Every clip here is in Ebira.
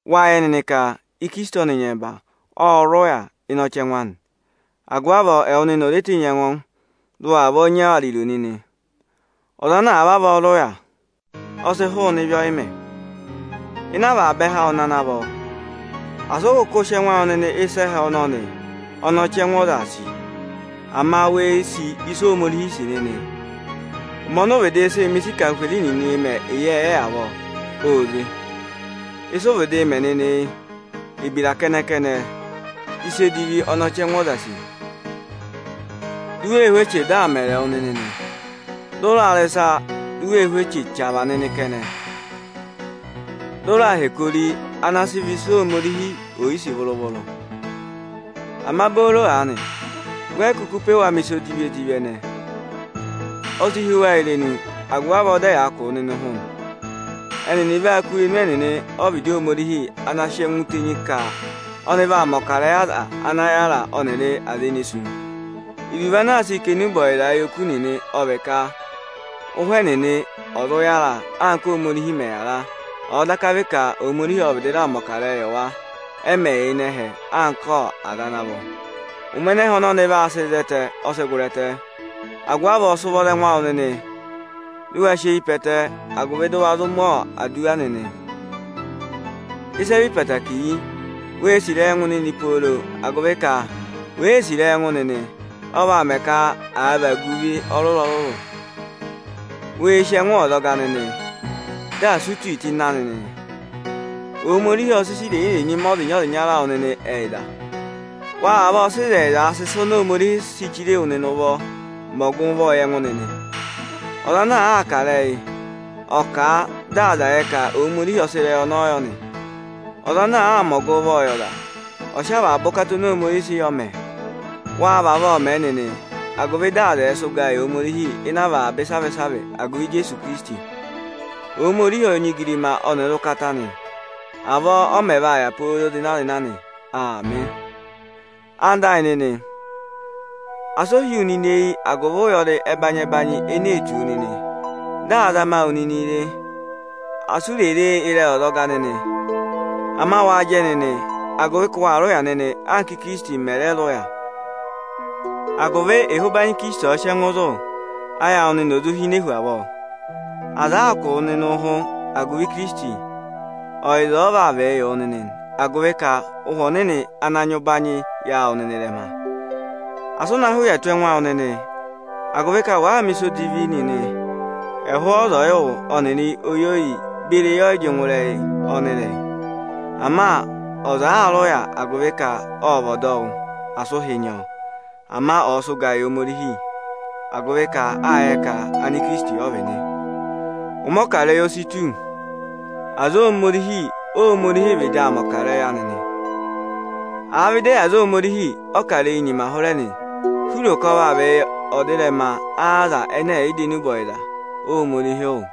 Wáa yẹ nịnị ka Ikirisiti ọnị nyẹmba ọ́ọ rị ụya ịnị ọchẹngụ anị. Agụvị avọọ ẹwụ nịnị ò re tenyi ẹngụ, dị ụ wa vavọọ nyị ariro nịnị! Ọza ana àa vavọọ rị ụya, ọ sị hụụnị ịvị ọyịmẹ̀. Ịnị avaba ẹhẹ awụ nịnị ana vọ, sị ụ kụkụ sị ẹngụ awụ yị ịsa ẹhẹ ọnọnị ọnị ọchẹngụ ọzaā sì! Ama wee sì ịsị Ohomorihi òo sì nịnị. Ụmẹ ọnị vịdị sị mẹ̀ ịsa ọnị anarịmadọwụ nịnịị̄ mẹ avọọ, óo ze. Ịsị ụ vịdịị mẹ nịnị yị: Ebira kẹnẹ-kẹnẹ, ịsa edivi ọnị ọchẹngụ ọzaā sì, di u wee hú eche dị aa mẹrị wụ nịnị; dị ụ raa rị ịsa di u wee hú eche chavaa nịnị kẹnẹ. Ụ rẹẹ̄ hẹkẹ ori nịnị ana vị ịsa Ohomorihi ò yi sì vụrụ-vụrụ nịnị. Ama booro aanị we yi kuku pe wa mẹ̀ ịsa edivi-edivi ẹnẹẹ nịnị. O si hí wa irenu, agụvị avọọ, dị ẹyaa kụ̀ wụ nịnị ụhụ nị. Ẹnịnị vaa kụ́ irenu ẹnịnị ọ́vịdị Ohomorihi ana sị ẹngụ tenyi ka ọnị vaa mẹ̀ ọkarẹyị aza ana yára ọnịrị aza ne wusu. Iruvo ana sị kà enube ọyịza yị oku nịnị, ọ vị ka ụhwẹ ẹnịnị ẹ̀ zụ yára, anka Ohomorihi mẹ̀ yára, ọ̀ọ daka vị ka Ohomorihi ộ vị raa mẹ̀ ọkarẹyị yị wa, ẹ mẹ̀ yị yà ịnị ẹhẹ anka aza ana vọ. Ụmẹ ẹnẹ ẹhẹ ọnọnị vaa sị zẹtẹ, ọ sị gụrị ẹtẹ. Agụvị avọọ sị ụvọ za ẹngụ awụ nịnị, dị ụ wa sị eyi pe ẹtẹ, agụvị dị ụ wa zụụ mẹ̀ aduwa nịnị! Ịsị e hu keekere yị: Wee sì ịrẹyị ẹngụ nịnị pooro, agụvị ka wèe sì ịrẹyị ẹngụ nịnị, ọ vaa mẹ ka à vagu ịvị ọrụrụ-ọrụrụ. Wee si ẹngụ ọzọga nịnị, dị asị u ti tụ́ ịnị anị nịnị. Ohomorihi ộ sị ịsa irenyi-irenyi mẹ ọzịnya-ọzịnya awụ nịnị ẹyịza. Wa vavọọ sị ịzẹyịzaa sị ịsa oni Ohomorihi òo si chire wu nịnị ụvọọ mẹ ọgụvọọ yị ẹngụ nịnị. Ọza ana àa kà ịrẹyị, ọ̀ọ kà a dị aza ẹ̀ yẹ ka Ohomorihi ọ sị ịrẹyị ọnọọ yọ nị. Ọza ana àaa mẹ ọgụvọọ yị ọza, ọ̀ọ sị avaba ụkata ọnị Ohomorihi sị yọọ mẹẹ. Wa vavọọ mẹ nịnị, agụvị dị aza ẹ̀ẹ sị ụgaa yị Ohomorihi ịnị avaba ịsavị-ịsavị agụvị Ijeesu Ikirisiti. Ohomorihi ọ nyị igirima ọnịrị ụkata nị, avọọ ọ mẹ vaa yà pooro zịna-zịna nị. Aamị. Ẹwụ nịnị ẹyịnyara amị, asị o hí wu nịnị eyi agụvị ụyọrị ẹbanyị-ẹbanyị ene ee tù wu nịnị, dị aa zama wụ nịnịị re. Asị ụ re e ịrẹyị ọzọga nịnị. Ama waa jẹ nịnị, agụvị ka waa rị ụya nịnị, anka Ikirisiti mẹ̀ rẹ rị ụya, agụvị ịhị ụbanyị Ikirisiti ọ̀ọ sị ẹngụ zụ, ayị awụ nịnị ò zụ hine hu avọọ. Aza àa kụ̀ wụ nịnị ụhụ agụvị Ikirisiti, ọyịza ọ vaa vịị yị wụ nịnị nị; agụvị ka Ụhwẹ Ọnịnị ana nyị ụbanyị yàa wụ nịnị ịrẹma. Asị ụ na hị́ ụya tù ẹngụ awụ nịnị, agụvị ka waa mẹ̀ ịsa odivi nịnị ẹ̀ hụ ọza ọyịwụ ọnịrị oyi oyiyi beri eyi ọyị jị ngụ ịrẹyị ọnịrẹyị. Ama ọza àaa rị ụya agụvị ka ọ́ọ vị ọdọwụ, asị ụhị nyị ọ. Ama ọ̀ọ sị ụgaa yị Ohomorihi, agụvị ka a vaa yẹ ka evere Ikirisiti ọ vị nị. Ụmẹ ọkarẹyị o si tù, aza Ohomorihi Óhomorihi vaa vịdị aa mẹ̀ ọkarẹyị anị nị. Àa vị ịdị ẹyị aza Ohomorihi, ọkarẹyị nyima hụrẹ nị, si ụ ro ka ọ vaa vị ẹzẹtẹ aza ẹnẹ ẹ̀ yị dọ enube ọyịza Ohomorihi wụ́?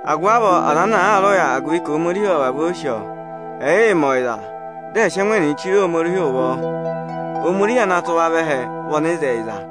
Agụvị avọọ aza ana aa rị ụya agụvị ka Ohomorihi ọ́ọ vavọọ sì ọ, ẹ̀yịị mẹ ọyịza, dị ẹ̀ sị ẹngụ ẹnịnị chire Ohomorihi ụvọ! Ohomorihi ana tụ́ wa vẹ ẹhẹ vị ọnịzẹyịza.